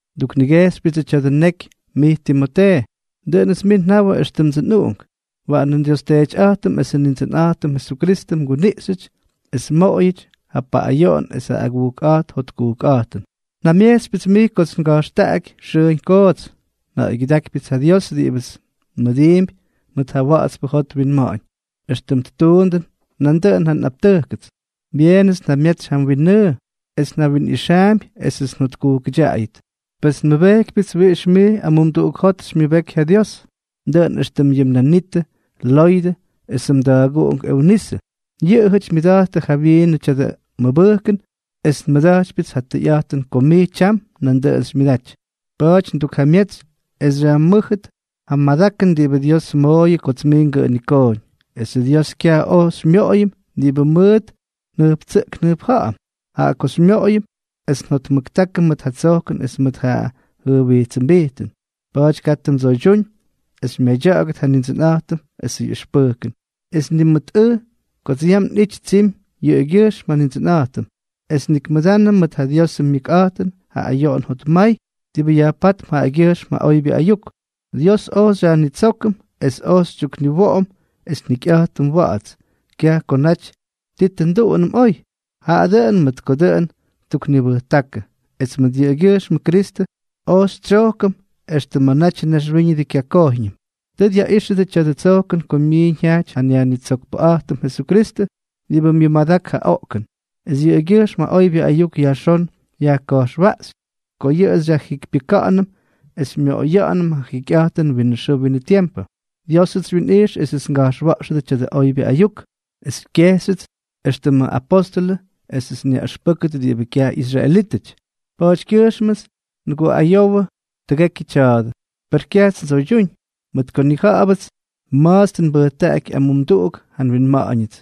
Nduknigejxypyʉdsʉ tya̱dʉ neky mij Timotee. Dʉꞌʉnʉts mij njawʉ éxtʉmdsʉ nꞌuꞌunk. Waꞌanʉ nDios Teetyꞌa̱jtʉm esʉ Nindsʉnꞌa̱jtʉm Jesukristʉ mguniꞌxyʉty es mmoꞌoyʉty ja paꞌꞌayoꞌon es ja agujkꞌa̱jt jotkujkꞌa̱jtʉn. Njamyejtsypyʉts mij kots nga̱jxtaꞌaky xʉʉñ koots. Nja̱ꞌa̱ygyʉdákypyʉts ja Dios diꞌibʉts nmʉdiimpy mʉt ja wa̱ꞌa̱tspʉ jot winma̱ꞌa̱ñ, éxtʉm ttuundʉ nandʉꞌʉn ja nꞌaptʉjkʉts. Byeenʉts njamyetsy ja mwinnʉʉ, es njawinꞌixaampy esʉts njotkujkʉdyaꞌayʉt. Pes njamyejtsypyʉts wiꞌix mij amumduꞌuk jot xymyʉbeky ja Dios, dʉꞌʉn éxtʉm yʉ mnanitʉ Loydʉ esʉ mda̱a̱guꞌunk Eunisʉ, yʉꞌʉjʉty myʉda̱jttʉ jawyiinʉ tya̱dʉ mʉbʉjkʉn, es nmʉda̱jtypyʉts ja tʉyꞌa̱jtʉn ko mij tyam nandʉꞌʉn xymyʉdaty. Pa̱a̱ty ndukjamyetsy es xyajmʉ́jʉt ja madakʉn diꞌibʉ Dios mmooyʉ kots mij ngʉꞌʉnikooñ. Pesʉ Dios kyaj oj xymyoꞌoyʉm diꞌibʉ mʉʉt njʉjptsʉꞌkʉm njʉjpja̱ꞌa̱m, jaꞌa ojts xymyoꞌoyʉm es njotmʉktákʉm mʉt ja tsojkʉn es mʉt ja jʉjwijtsʉmbijtʉn. Pa̱a̱ty katʉ mdsoydyúñ es xymyadya̱ꞌa̱gʉt ja Nindsʉnꞌa̱jtʉm esʉ ꞌyʉxpʉjkʉn, es ni mʉt ʉj kots yam nꞌity tsimy yʉꞌʉgyʉjxm ja Nindsʉnꞌa̱jtʉm, es nik mʉdanʉ mʉt ja Diosʉ myʉkꞌa̱jtʉn ja ayoꞌon jotmay diꞌibʉ yajpátp jaꞌagyʉjxm ja oybyʉ ayuk. Dios oj xyajnitsókʉm es oj xytyukniwoꞌom es njikyꞌa̱jtʉm wa̱ꞌa̱ts, kyaj ko naty ti tʉ nduꞌunʉm oy, jaꞌa dʉꞌʉn mʉt ko dʉꞌʉn ttuknibʉjtákʉ, es mʉt yʉꞌʉgyʉjxmʉ Kristʉ oj xytsyojkʉm extʉ ma̱ natyʉ naxwíñʉdʉ kyakojyñʉm. Tʉ dyaꞌíxyʉdyʉ tya̱dʉ tsojkʉn ko myiiñ jyajty ja nYajnitsokpʉꞌa̱jtʉm Jesukristʉ, diꞌibʉ myʉmadak ja oꞌkʉn, es yʉꞌʉgyʉjxm ja oybyʉ ayuk yajxón yajka̱jxwaꞌxy ko yʉꞌʉ xyajjikypyʉka̱ꞌa̱nʉm es xymyoꞌoya̱ꞌa̱nʉm ja jikyꞌa̱jtʉnʉ winʉ xʉʉ winʉ tiempʉ. Diósʉts xywyinꞌijx esʉts nga̱jxwa̱ꞌxʉdʉ tya̱dʉ oybyʉ ayuk, es xykyejxyʉts éxtʉmʉ apóstʉlʉ esʉts nyaꞌʉxpʉ́kʉt diꞌibʉ kyaj ꞌyisraelítʉty. Pa̱a̱tykyʉjxmʉts nguꞌayowʉ tʉgekyʉ tya̱a̱dʉ. Per kyajts ndsoydyúñ, mʉt ko nnija̱ꞌa̱bʉts ma̱ts tʉ nbʉjtaꞌaky amumduꞌuk ja nwinma̱ꞌa̱ñʉts,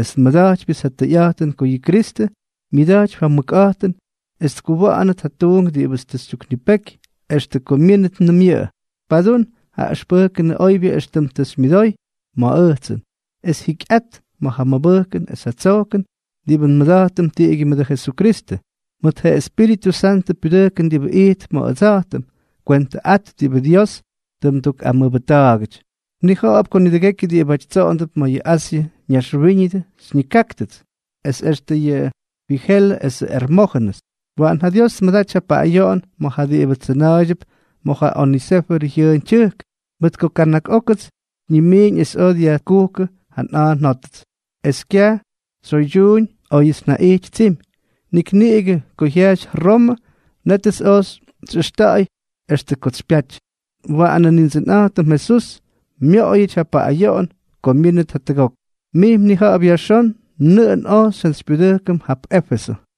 es nmʉda̱jtypyʉts ja tʉyꞌa̱jtʉn ko yʉ Kristʉ myʉda̱jtypy ja mʉkꞌa̱jtʉn es tkuwa̱ꞌa̱nʉt ja tuunk diꞌibʉts tʉ xytyuknipeky extʉ ko myínʉtnʉm yʉꞌʉ. Padún ja ʉxpʉjkʉnʉ oybyʉ éxtʉm tʉ xymyʉdoy ma̱ ʉjtsʉn, es jikyꞌat ma̱ ja mʉbʉjkʉn es ja tsojkʉn diꞌibʉ nmʉda̱jtʉm tiꞌigyʉ mʉdʉ Jesukristʉ. Mʉt ja Espíritʉ Santʉ pyudʉjkʉn diꞌibʉ ijtp ma̱ ʉdsa̱jtʉm, kwentʉꞌat diꞌibʉ Dios tʉ mdukꞌamʉbʉjta̱a̱gʉty. Mnija̱ꞌa̱p ko nidʉgekyʉ diꞌibáty tsoꞌondʉp ma̱ yʉ Asyʉ ñaxwíñʉdʉ xyñikáktʉts, es extʉ yʉ Fijelʉ esʉ Ermójʉnʉs. Waꞌan ja Dios tmʉdaty ja paꞌꞌayoꞌon ma̱ ja diꞌibʉ tsʉna̱a̱ydyʉp ma̱ ja Onesífʉrʉ jyʉʉn tyʉjk, mʉt ko kana̱k ókʉts xyñimiiñ es oj dyajkujkʉ ja nꞌa̱a̱ njótʉts, es kyaj tsyoydyuuñ óyʉts njaꞌijty tsimy. Nik niꞌigʉ ko jyajty Romʉ, nétʉts oj xyꞌʉxta̱ꞌa̱y extʉ kots xypyaty. Waꞌanʉ Nindsʉnꞌa̱jtʉm Jesús myoꞌoyʉty ja pyaꞌꞌayoꞌon ko myínʉt jatʉgok. Mij mnija̱ꞌa̱p yajxón nʉꞌʉn oj xyjantsypyudʉjkʉm jap Éfesʉ.